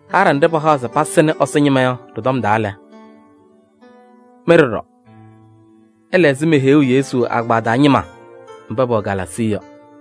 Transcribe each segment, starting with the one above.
Haɖɛ nɖɩ pahaɣ se pasɩnɩ Ɛsɔ ñɩma yɔ ɖɩ-tɔm taa lɛ, mɩ ɖɔɖɔ ɩla ɛzɩ meheyuu Yesu agbaa taa ñɩma mba pɛwɛ Galaasii yɔ.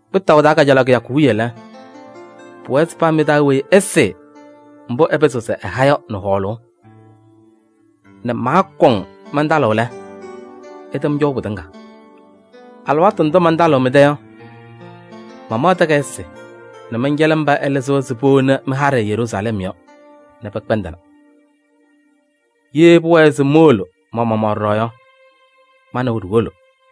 Kpɩtaʋ taa kajalaɣ kɩyakʋ wiye lɛ, pʋwɛɛ se paa mɩ-taa weyi ɛsɩɩ mbʋ ɛpɩzɩɣ se ɛha yɔ nɛ hɔɔlʋʋ nɛ maakɔŋ mantalɩɣ lɛ, ɩtɛm cɔʋ pɩtɩŋa. Alɩwaatʋ ndʋ mantalɩɣ mɩ-tɛ yɔ, mamaɣ takayɩsɩ nɛ mɛncɛlɩ mba ɩlɩzɩ-wɛ se powoni mɩ-haɖɛ Yeruusalɛm yɔ nɛ pɛkpɛndɩna. Ye pʋwɛɛ se mowolo ma-maɣmaɣ ɖɔɖɔ yɔ, ma nɛ wɛ ɖiwolo.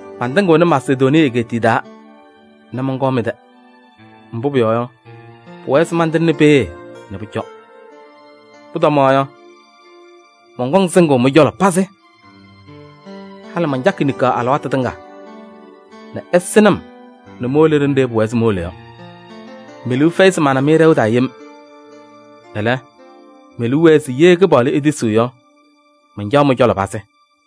Mantɩŋɩɣnɩ Masedonii egeetiye taa nɛ mɔnkɔɔ mɩ-tɛ. Mbʋ pʋyɔɔ yɔ, pʋwɛɛ se mantɩŋnɩ peeye nɛ pʋcɔ. Pʋtɔmaɣ yɔ, mɔnkɔŋ sɩŋʋʋ mɩ-cɔlɔ pazɩ. Halɩ mancakɩ niŋkaɣ alɩwaatʋ tɩŋa nɛ ɩsɩnɩ-m nɛ mowolo ɖenɖe pʋwɛɛ se mowolo yɔ. Me-liu fɛyɩ se mana-mɩ ɖɛʋ taa yem. Ɛlɛ, me-liu wɛɛ se ye Kɩpaɣlʋ etisiɣ yɔ, mancaɣ mɩ-cɔlɔ pazɩ.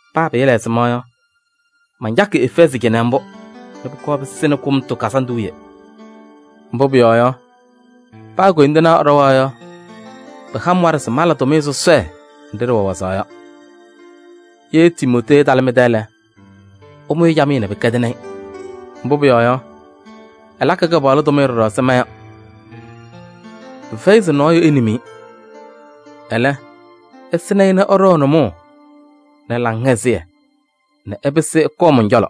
Paa pɩɩla ɛzɩma yɔ, mancakɩ Efɛɛzɩ cɩnɛ mbʋ nɛ pʋkɔɔ pɩsɩnɩ Kʋmtʋ Kazandʋ wiye. Mbʋ pʋyɔɔ yɔ, paa koyindinaa ɛɖɔwa yɔ, pɩha-m waɖɛ se mala tʋmɩyɛ sɔsɔɖɛ nɖɩ ɖɩwɛ wazaɣ yɔ. Ye Timootee ɛtalɩ mɩ-tɛ lɛ, ɩmʋ-ɩ camɩyɛ nɛ pɩkɛdɩnɩ-ɩ. Mbʋ pʋyɔɔ yɔ, ɛlakɩ Kɩpaɣlʋ tʋmɩyɛ ɖɔɖɔ ɛzɩ ma yɔ. Pɩfɛyɩ se nɔɔyʋ enim-i. Ɛlɛ, ɩsɩnɩ-ɩ nɛ ɛɖɔ ɛ-nʋmɔʋ nɛ laŋhɛzɩyɛ nɛ ɛpɩsɩ ɛkɔɔ mɔn-cɔlɔ.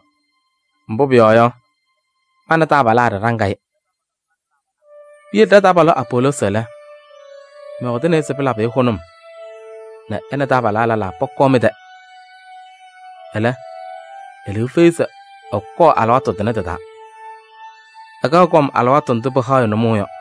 Mbʋ pʋyɔɔ yɔ, ma nɛ taabalaa ɖɩɖaŋ-ɩ. Piyele ɖa-taabalʋ Apoloosi lɛ, mɔyɔɔdɩnɩ-ɩ se pɩlabɩ-ɩ hʋnʋm nɛ ɛ nɛ taabalaa lɛlaa pɔkɔɔ mɩ-tɛ. Ɛlɛ, e-liu fɛyɩ se ɛkɔɔ alɩwaatʋ tʋnɛ tɩ-taa. Ɛkaɣ kɔm alɩwaatʋ ndʋ pɩhaɣ-ɩ nʋmɔʋ yɔ.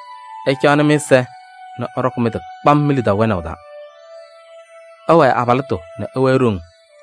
Ɩcaɣnɩ mɩ-ɛza nɛ ɩɖɔkɩ mɩ-tɩ kpam mi-lidaʋ wɛnaʋ taa. Ɩwɛɛ abalɩtʋ nɛ ɩwɛɛ ɖoŋ.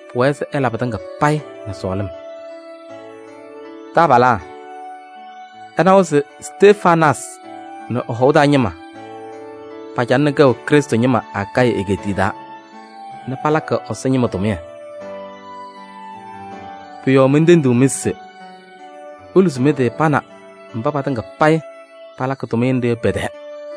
Pʋwɛɛ se ɩla pɩtɩŋa payɩ nɛ sɔɔlɩm. Taabalaa, ɩnawa se Stefanaasɩ nɛ ɛ-hɔʋ taa ñɩma pacalɩnɩ kɛʋ Krɩstʋ ñɩma Akayɩ egeetiye taa nɛ palakɩ Ɛsɔ ñɩma tʋmɩyɛ. Pʋ-yɔɔ mentendiɣ-mɩ se: iluzi mɩ-tɩ pa nɛ mba patɩŋa payɩ palakɩ tʋmɩyɛ nɖɩ yɔ pɛ-tɛɛ.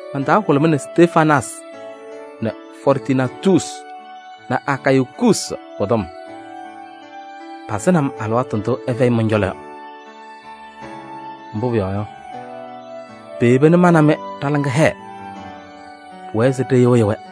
Man-taa hʋlʋmɩnɩ Stefanaasɩ nɛ Fɔɔrtunaatusi nɛ Akayikuusi pɔ-kɔm. Pasɩnɩ-m alɩwaatʋ ndʋ ɩfɛyɩ mɔn-cɔlɔ yɔ. Mbʋ pʋyɔɔ yɔ, peyeba nɛ ma nɛ mɩ ɖa-laŋa hɛɛ. Pʋwɛɛ se ɖɩyɩɣyɩ-wɛ.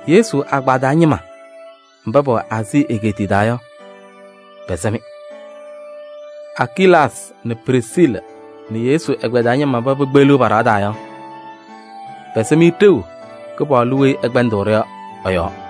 Yesu agbaa taa ñɩma mba pɛwɛ Aazii egeetiye taa yɔ, pɛsɛ-mɩ. Akilaasɩ nɛ Prisiili nɛ Yesu ɛgbɛyɛ taa ñɩma mba pekpeɣliɣ pa-ɖɩɣa taa yɔ, pɛsɛ-mɩ ɖeu Kɩpaɣlʋ weyi ɛkpɛndɩɣ-ɖʋ yɔ ɛ-yɔɔ.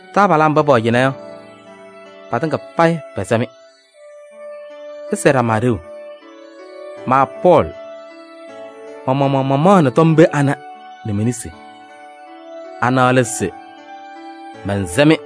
Taabalaa mba pɛwɛ cɩnɛ yɔ, patɩŋa payɩ pɛsɛ-mɩ. Ɩsɛɛ ɖama ɖeu. Ma Pɔɔlɩ, ma-maɣmaɣ mamaɣnɩ tɔm pee anɛ nɛ me-nesi. Ana lɛ se: mɛnsɛ-mɩ.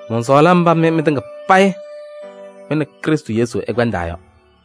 Mɔnsɔɔlɩ mba mɩ mɩtɩŋa payɩ mɩ nɛ Krɩstʋ Yesu ɩkpɛndaa yɔ.